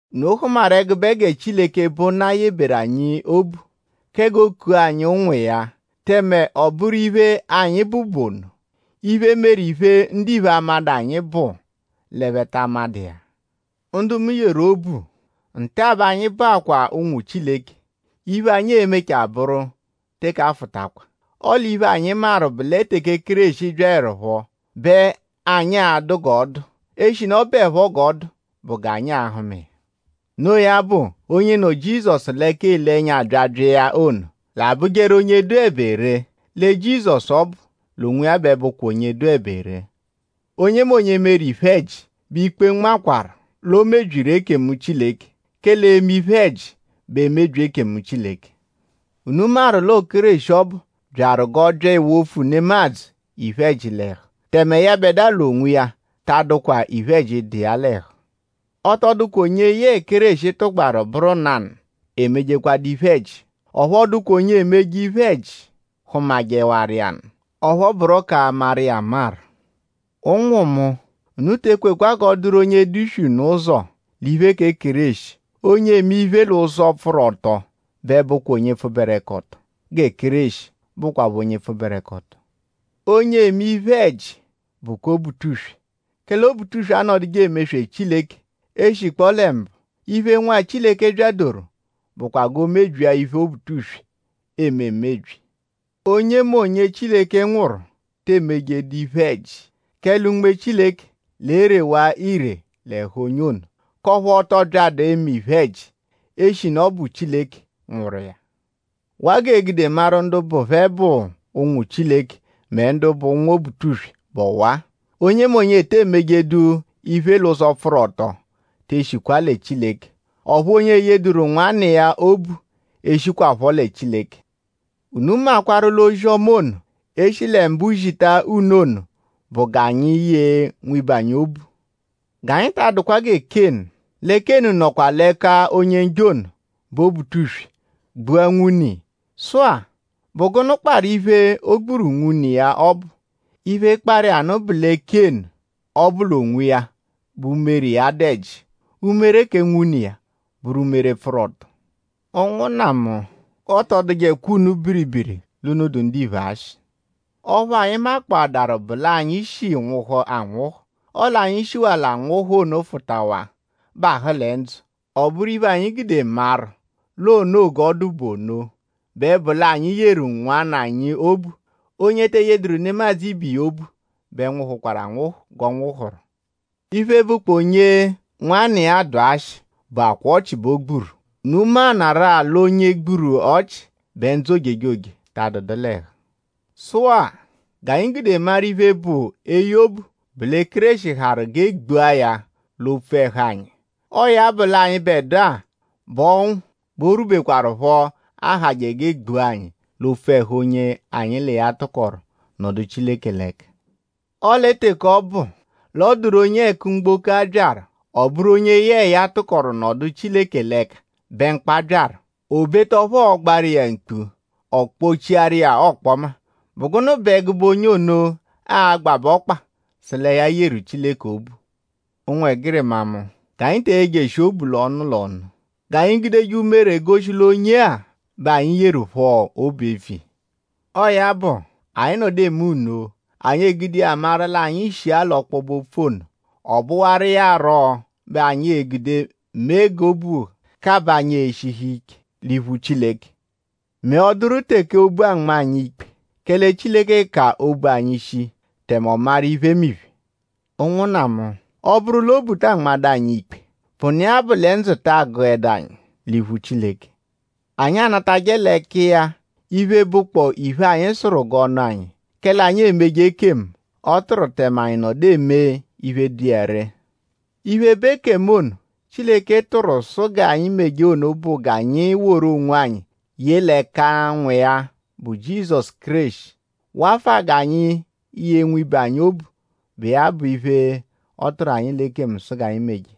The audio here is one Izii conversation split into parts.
Unu hụmaru ẹgube gẹ Chileke, bụ Nna yebewaru anyi obu kẹ g'ọ kua anyi ụnwu iya; tẹme ọ bụru iphe, anyi bụ bụ ono. Iphe, meru iphe, ndiphe amadụ anyi bụ l'ẹphe ta amadụ iya. Ndu mu yeru obu; nta-a bẹ anyi bụakwaa ụnwu Chileke. Iphe, anyi e-mechaa bụru teke afụtakwa; ọle iphe, anyi maru bụ lẹ teke Kéreshi byaẹrupho bẹ anyi a-dụ g'ọ dụ; eshinu ọ bụepho g'ọ dụ bụ g'anyi a-hụma iya. Noo ya bụ; onye nọ Jizọsu l'ẹka ele ẹnya abyabya iya ono; l'a-bụjeru onye dụebe ree; lẹ Jizọsu ọbu l'onwiya bẹ bụkwa onye dụebe ree. Onyemonye meru iphe-ẹji bẹ ikpe nmaakwaru l'o mebyiru ekemu Chileke; kẹle eme iphe-ẹji bụ emebyi ekemu Chileke. Unu maru l'ọo Kéreshi ọbu byaru g'ọ bya ewofu nemadzụ iphe-ẹji l'ẹhu; tẹme yẹbedua l'onwiya ta adụkwa iphe-ẹji, dụ iya l'ẹhu. Ọ tọ dụkwa onye yẹe Kéreshi tụgbaru bụru nanụ emejekwadu iphe-ẹji; ọphu ọ dụkwa onye emeje iphe-ẹji hụmajewaru iya nụ; ọphu ọ bụro k'amaru iya amaru. Ụnwu mu; unu te ekwekwa g'ọ dụru onye e-duswee unu ụzo l'iphe kẹ Kéreshi. Onye eme iphe l'ụzo, pfụru ọto bẹ bụkwa onye pfụberekoto gẹ Kéreshi bụkwapho onye pfụberekoto. Onye eme iphe-ẹji bụ kẹ Obutuswe; kẹle Obutuswe anọduje emeswe Chileke e -shikpọo lẹ mbụ. Iphe, Nwa Chileke byadoru bụkwa g'o mebyia iphe Obutuswe eme emebyi. Onyemonye, Chileke nwụru te emejeẹdu iphe-ẹji; kẹle Unme Chileke l'erewa ire l'ẹhu onye ono; k'ọphu ọ tọ byadu emeje iphe-ẹji; eshinu ọ bụ Chileke nwụru iya. Waa g'ee-gude maru ndu bụ phẹ bụ ụnwu Chileke; mẹ ndu bụ ụnwu Obutuswe bụ ọwa-a: onyemonye ete emejedu iphe l'ụzo pfụru ọto te shikwa lẹ Chileke; ọphu onye eyeduru nwanna iya obu eshikwaphọ lẹ Chileke. Unu makwarụ l'ozi-ọma ono, e shi lẹ mbụlembu zita unu ono bụ g'anyi yee nwibe anyi obu. G'anyi ta adụkwa gẹ Kénu. Lẹ Kénu nọkwa l'ẹka Onye-Njọ ono, bụ Obutuswe gbua nwune iya. Sụ-a;?bụ gụnu kparụ iphe, o gburu nwune iya ọbu? Iphe, kparụ iya nụ bụ lẹ Kénu ọbu l'onwiya bẹ umere iya dụ ẹji; umere kẹ nwune iya bụru umere, pfụru ọto. Ụnwunna mu; g'ọ tọ dụjekwa unu biribiri l'unu dụ ndiphe ashị. Ọphu anyi makpọadaru bụ l'anyi shi nwụhu anwụhu; ọle anyi shiwaa l'anwụhu ono fụtawaa; bahụ lẹ ndzụ. Ọ bụru iphe, anyi gude maru l'o noo g'ọ dụ bụ ono bẹ bụ l'anyi yeru ụnwunna anyi obu. Onye te eyeduru nemadzụ ibiya obu bẹ nwụhukwaru anwụhu g'ọ nwụhuru. Iphe, bụkpoo onye nwanna iya dụ ashị bụakwaa ọchi bẹ o gburu; unu maanarụ-a l'onye gburu ọchi bẹ ndzụ ojejoje ta nọdu l'ẹhu. Sụ-a; g'anyi gude maru iphe, bụ eye obu bụ lẹ Kéreshi harụ g'e gbua ya l'opfu ẹhu anyi. Ọo ya bụ l'anyịbedua bẹ o rwubekwaruphọ ahajẹ g'e gbua anyi l'opfu ẹhu onye anyi l'iya tụkoru nọdu Chileke l'ẹka. Ọle teke ọ bụ l'ọ dụru onye ẹku mgboko-a byaru; ọ bụru onye yẹe ya tụkoru nọdu Chileke l'ẹka bẹ mkpa byaru; obeta ọphu ọogbaru iya mkpu ọ kpọ-chiaru iya ọkpoma;?bụ gụnu bẹ ẹgube onye ono a-gbabẹ ọkpa sụ lẹ ya yeru Chileke obu? Ụnwegirima mu; g'anyi te eyejeshi obu l'ọnu l'ọnu; g'anyi gudeje umere goshi l'onye-a bẹ anyi yeru phọ obu eviya. Ọo ya bụ; anyi -nọdu eme nno; anyi egude iya maru l'anyi shi-a l'ọkpobe-opfu ono. Ọobuwaru iya rọ bẹ anyi e-gude mee g'obu kabaa anyi eshihu ike l'iphu Chileke; mẹ ọ -dụru teke obu anma anyi ikpe; kẹle Chileke ka obu anyi shii; tẹme ọ maru iphemiphe. Ụnwunna mu; ọ -bụru l'obu ta anmajẹdu anyi ikpe; bụnu iya bụ lẹ ndzụ ta agụedu anyi l'iphu Chileke. Anyi anatajẹ l'ẹka iya iphe, bụkpoo iphe, anyi sụru g'ọ nụ anyi; kẹle anyi emeje ekemu, ọ tụru; tẹme anyi nọdu eme iphe, dụ iya ree. Iphe, bụ ekemu ono, Chileke tụru sụ g'anyi meje ono bụ g'anyi woru onwanyi ye l'ẹka Nwa iya bụ Jizọsu Kéreshi; wafụa g'anyi yee nwibe anyi obu, bụ iya bụ iphe, ọ tụru anyi l'ekemu sụ g'anyi meje.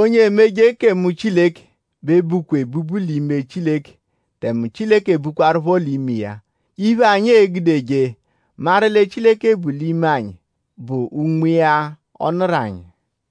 Onye emeje ekemu Chileke bẹ bukwa ebubu l'ime Chileke tẹme Chileke bukwaruphọ l'ime iya. Iphe, anyi egudeje maru lẹ Chileke bu l'ime anyi bụ Unme iya, ọ nụru anyi.